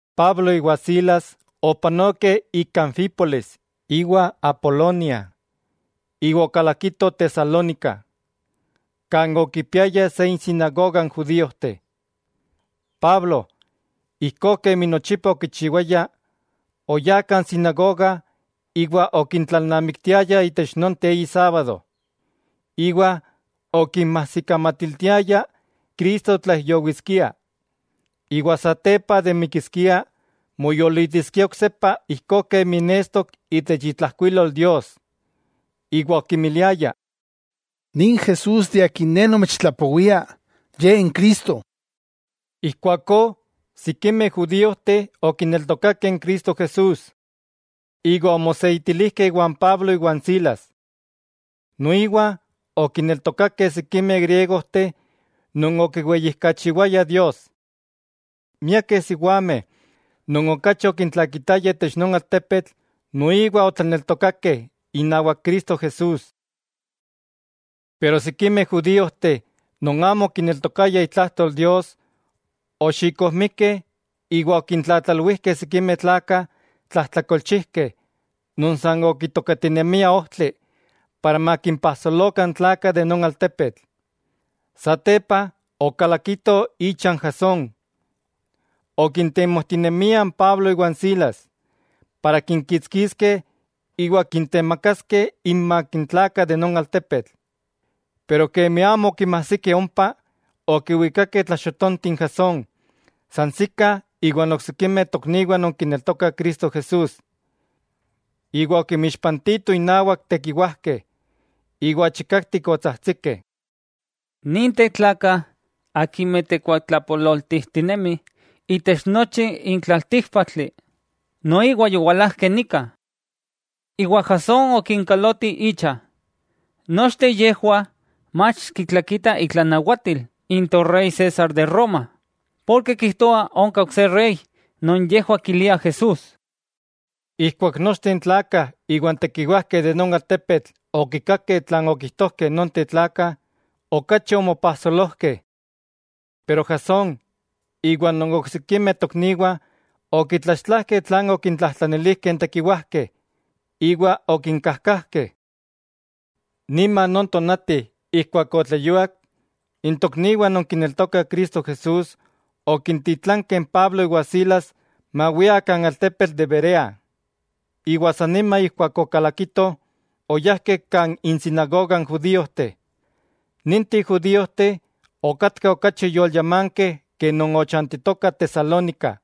Pablo iwa Silas opanokeh ik Anfípolis iwa Apolonia, iwa okalakitoh Tesalónica, kan okipiayah se insinagoga n judíojteh. Pablo, ijkó kemi nochipa okichiwaya, oyá kan sinagoga iwa okintlalnamiktiaya itech nonteh eyi sábado. Iwa okinmajsikamatiltiaya Cristo tlaijyowiskia, iwa satepa de mikiskia, moyolitiskia oksepa kemi nestok itech itlajkuilol Dios. Iwa okimiliaya: —Nin Jesús de akin ne nomechtlapowia, Ye n Cristo. Ijkuakó sikimeh judíojteh okineltokakeh n Cristo Jesús, iwa omoseitilijkeh iwan Pablo iwa n Silas. Noiwa okineltokakeh sikimeh griegojteh non okiweyijkachiwayah Dios. Miakeh siwameh non okachi okintlakitayah itech non altepetl noiwa otlaneltokakeh inawak Cristo Jesús. Pero sikimeh judíojteh non amo okineltokayah itlajtol Dios, oxikojmikeh iwa okintlatlalwijkeh sikimeh tlakah tlajtlakolchijkeh non san okitokatinemiah ojtli para makimpajsolokah n tlakah de non altepetl. Satepa okalakitoh icha n Jasón, okintemojtinemiah n Pablo iwa n Silas, para kinkixtiskeh iwa kintemakaskeh inmak n tlakah de non altepetl. Pero kemi amo okinmajsikeh ompa, okiwikakeh tlaxotonti n Jasón sansikah iwa n oksikimeh tokniwah non kineltokah Cristo Jesús, iwa okimixpantitoh innawak tekiwajkeh, iwa chikaktik otsajtsikeh: —¡Ninteh tlakah, akimeh tekuatlapololtijtinemih itech nochi n tlaltíkpaktli, noiwa yowalajkeh nika! Iwa Jasón okinkaloti icha. Nochteh yejwah mach kitlakitah itlanawatil n torey César de Roma, porke kijtoah onka ok se rey non yejwah kiliah Jesús. Ijkuak nochteh n tlakah iwa n tekiwajkeh de non altepetl okikakeh tlan okijtojkeh nonteh tlakah, okachi omopajsolojkeh. Pero Jasón iwa non oksikimeh tokniwah okitlaxtlajkeh tlan okintlajtlanilijkeh n tekiwajkeh, iwa okinkajkajkeh. Niman non tonati ijkuak otleyuak, n tokniwah non kineltokah Cristo Jesús okintitlankeh n Pablo iwa Silas mawiah kan altepetl de Berea. Iwa san nima ijkuak okalakitoh, oyajkeh kan insinagoga n judíojteh. Ninteh judíojteh okatkah okachi yolyamankeh ke non ochantitokah Tesalónica.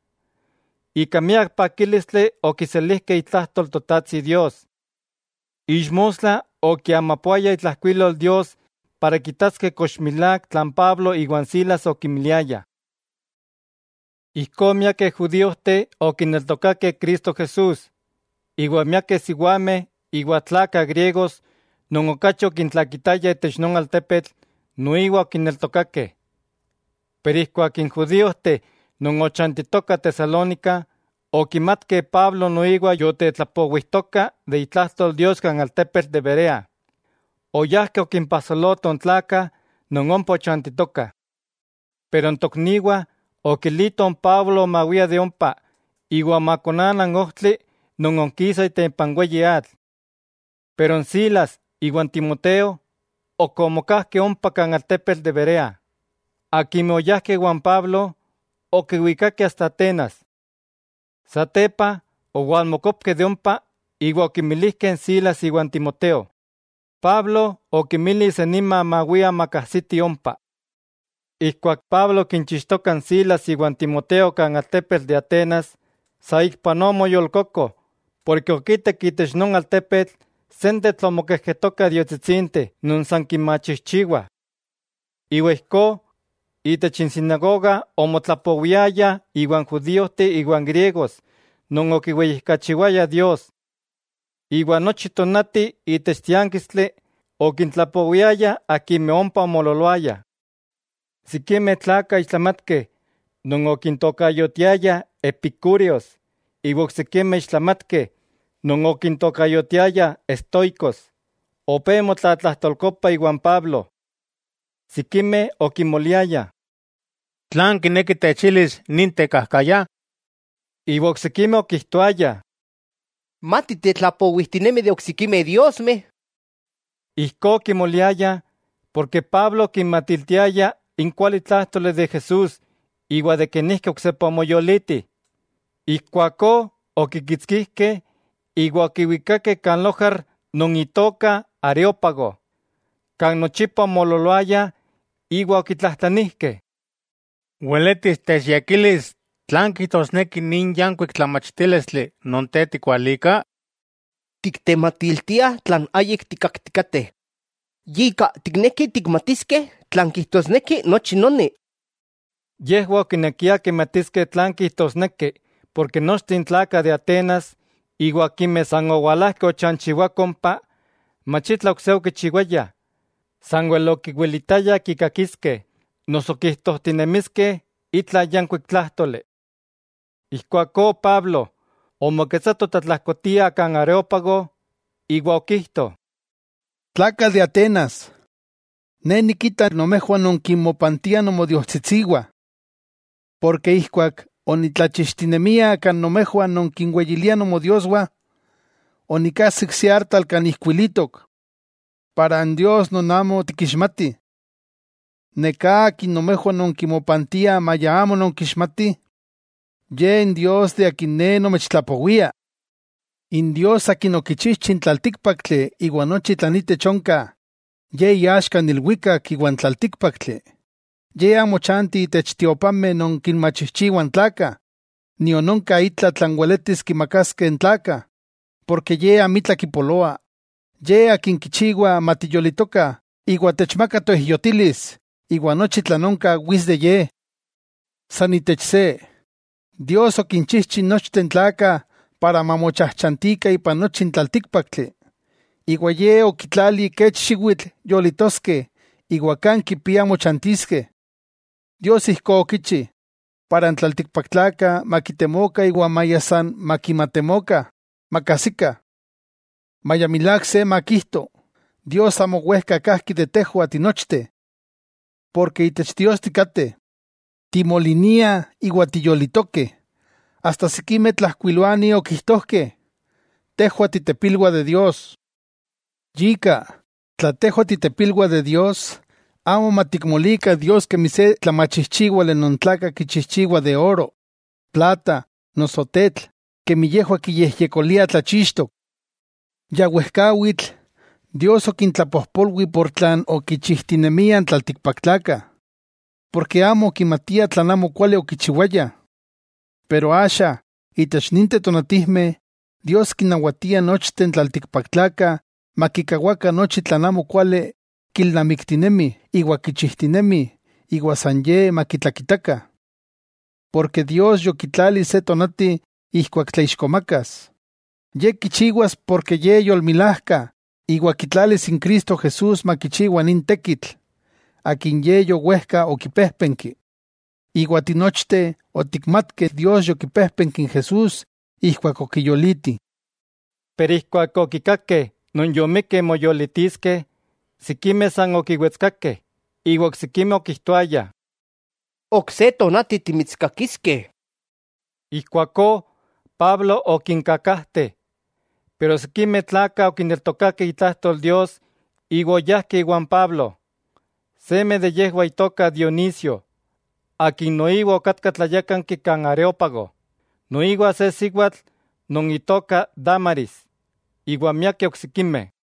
Ika miak pakílistli okiselijkeh itlajtol Totajtsi Dios. Ixmostla okiamapoaya itlajkuilol Dios para kitaskeh kox milák tlan Pablo iwa n Silas okimiliayah. Ijkó miakeh judíojteh okineltokakeh Cristo Jesús, iwa miakeh siwameh iwa tlakah griegos non okachi okintlakitayah itech non altepetl noiwa okineltokakeh. Pero ijkuak n judíojteh non ochantitokah Tesalónica okimatkeh Pablo noiwa yotetlapowijtoka de itlajtol Dios kan altepetl de Berea, oyajkeh okimpajsolotoh n tlakah non ompa ochantitokah. Pero n tokniwah okilitoh n Pablo mawia de ompa iwa makonana n ojtli non onkisa itempa n weyi atl. Pero n Silas iwa Timoteo ok omokajkeh ompa kan altepetl de Berea. Akimeh oyajkeh iwa n Pablo, okiwikakeh asta Atenas. Satepa owalmokopkeh de ompa iwa okimilijkeh n Silas iwa n Timoteo, Pablo okinmili san nima mawiah makajsitih ompa. Ijkuak Pablo okichixtoka n Silas iwa n Timoteo kan altepetl de Atenas, saikpanoa omoyolkoko porke okitak itech non altepetl sentetl omokejketokah diostsitsinteh non san kinmachijchiwah. Iwa ijkó, itech n sinagoga omotlapowiaya iwan judíojteh iwan griegos non okiweyijkachiwayah Dios. Iwa nochi tónati itech tiánkistli okintlapowiaya akimeh ompa omoololoayah. Sikimeh tlakah ixtlamatkeh non okintokayotiayah epicúreos, iwa n oksikimeh ixtlamatkeh non okintokayotiayah estoicos, opé motlatlajtolkopah iwan Pablo. Sikimeh okimoliayah: —¿Tlan kineki techilis nin tekajkaya? Iwa oksikimeh okijtoayah: —Mati tetlapowijtinemi de oksikimeh diosmeh. Ijkó okimoliayah porke Pablo okinmatiltiaya n kualitlájtoli de Jesús iwa de kenijki oksepa omoyoliti. Ijkuakó okikitskijkeh iwa okiwikakeh kan lojar non itoka Areópago, kan nochipa omoololoayah, iwa okitlajtlanijkeh: —¿Weletis techyekilis tlan kijtosneki nin yankuik tlamachtílistli non te tikualika? Tiktematiltia tlan ayik tikkaktikateh. Yika, tiknekih tikmatiskeh tlan kijtosneki nochi noni. Yejwah okinekiah kimatiskeh tlan kijtosneki porke nochteh n tlakah de Atenas, iwa akimeh san owalajkeh ochanchiwakoh ompa, mach itla ok se okichiwayah, sanwel okiwilitayah kikakiskeh noso kijtojtinemiskeh itla yankuik tlájtoli. Ijkuakó Pablo, omoketsato tlatlajkotia kan Areópago, iwa okijto: —Tlakah de Atenas, ne nikita nomejwah nonkinmopantiah nomodiostsitsiwah. Porke ijkuak onitlajtlachixtinemia kan nomejwah nonkinweyiliah nomodioswah, onikajsik se artal kan ijkuilitok: “Para n Dios non amo tikixmatih”. Neká akin nomejwah nonkimopantiah maya amo nonkixmatih, Ye n Dios de akin ne nomechtlapowia. 'N Dios Akin okichijchi n tlaltíkpaktli iwa nochi tlan itech onka, Ye iaxka n ilwikak iwa n tlaltíkpaktli. Ye amo chanti itech tiopameh non kinmachijchiwah n tlakah, nion onka itla tlan weletis kimakaskeh n tlakah, porke Ye amitla kipoloa, Ye Akin kichiwa matiyolitokah, iwa techmaka toijyotilis, iwa nochi tlan onka wits de Ye. 'San itech se, Dios okinchijchi nochteh n tlakah para mamochajchantikah ipan nochi n tlaltíkpaktli. Iwa Ye okitlali kech xiwitl yolitoskeh iwa kan kipiah mochantiskeh. Dios ijkó okichi, para n tlaltikpaktlakah makitemokah iwa maya san makimatemokah, makajsikah. Maya milák se makijto, Dios amo wejka kajki de tejwah tinochteh. Porke itech Dios tikateh, timoliniah iwa tiyolitokeh. Asta sikimeh tlajkuiloanih okijtojkeh: “Tejwah titepilwah de Dios.” Yika, tla tejwah titepilwah de Dios, amo matikmolikah Dios kemi se tlamachijchiwali non tlakah kichijchiwah de oro, plata, noso tetl kemi yejwah kiyejyekoliah tlachixtok. Ya wejkawitl, Dios okintlapojpolwi ika tlan okichijtinemiah n tlaltikpaktlakah, porke amo okimatiah tlan amo kuali okichiwayah. Pero axa itech ninteh tonatijmeh, Dios kinnawatia nochteh n tlaltikpaktlakah makikawakah nochi tlan amokuali kilnamiktinemih iwa kichijtinemih iwa san Ye makitlakitakah. Porke Dios yokitlali se tonati ijkuak tlaixkomakas. Ye kichiwas porke Ye yolmilajka iwa kitlalis n Cristo Jesús makichiwa nin tekitl, akin Ye yowejka okipéjpenki. Iwa tinochteh otikmatkeh Dios yokipéjpenki n Jesús ijkuak okiyoliti. Pero ijkuak okikakeh non yomikkeh moyolitiskeh, sikimeh san okiwetskakeh iwa oksikimeh okijtoayah: —Ok se tonati timitskakiskeh. Ijkuakó Pablo okinkakajte. Pero sikimeh tlakah okineltokakeh itlajtol Dios iwa oyajkeh iwan Pablo. Seme de yejwah itoka Dionisio, akin noiwa okatka tlayákanki kan Areópago, noiwa se siwatl non itoka Dámaris, iwa miakeh oksikimeh.